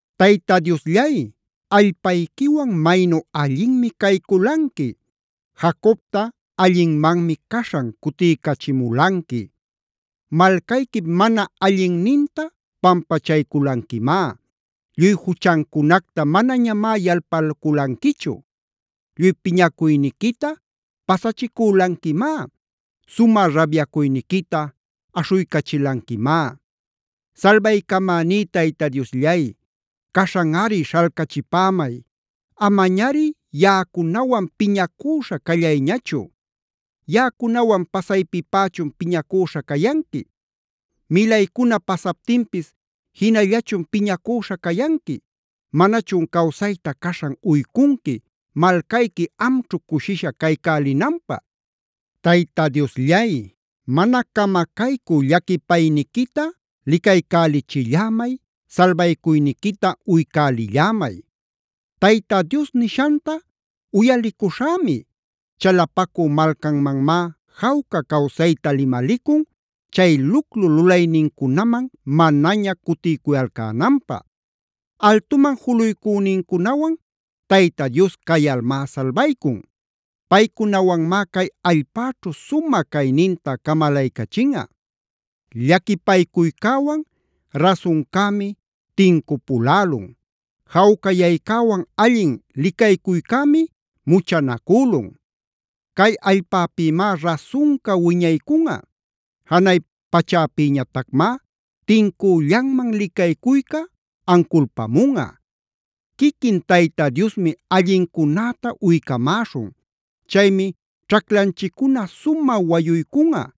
Tayta Diosllay, allpayquiwan maynu allinmi cayculanqui. Jacobta allinmanmi caśhan cutiycachimulanqui. Malcayquip mana allinninta pampachayculanquimá. Lluy juchancunacta manañamá yalpalculanquichu. Lluy piñacuyniquita pasachicülanquimá. Sumä rabyacuyniquita aśhuycachilanquimá. Salbaycamaní Tayta Diosllay, caśhanꞌari śhalcachipämay. Amañari yaꞌacunawan piñacüśha callayñachu. ¿Yaꞌacunawan pasaypipächun piñacüśha cayanqui? ¿Milaycuna pasaptinpis jinallachun piñacüśha cayanqui? ¿Manachun cawsayta caśhan uycunqui malcayqui amćhu cushisha caycälinanpä? Tayta Diosllay, mana camacaycü llaquipayniquita licaycälichillämay, salbacuyniquita uycälillämay. Tayta Dios nishanta uyalicuśhämi. Chalapacü malcanmanmá jawca cawsayta limalicun chay luclu lulaynincunaman manaña cutiycuyalcänanpä. Altuman juluycünincunawan Tayta Dios cayalmá salbaycun. Paycunawanmá cay allpäćhu sumä cayninta camalaycachinꞌa. Llaquipaycuycäwan rasuncämi tincupulälun. Jawcayaycäwan allin licaycuycämi muchanacülun. Cay allpäpïmá rasunca wiñaycunꞌa. Janay pachapïñatacmá tincüllanman licaycuyca anculpamunꞌa. Quiquin Tayta Diosmi allincunäta uycamäśhun. Chaymi ćhaclanchiccuna sumä wayuycunꞌa.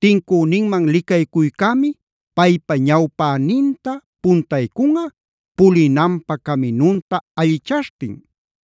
Tincüninman licaycuycämi paypa ñawpäninta puntaycunꞌa, pulinanpä caminunta allichaśhtin.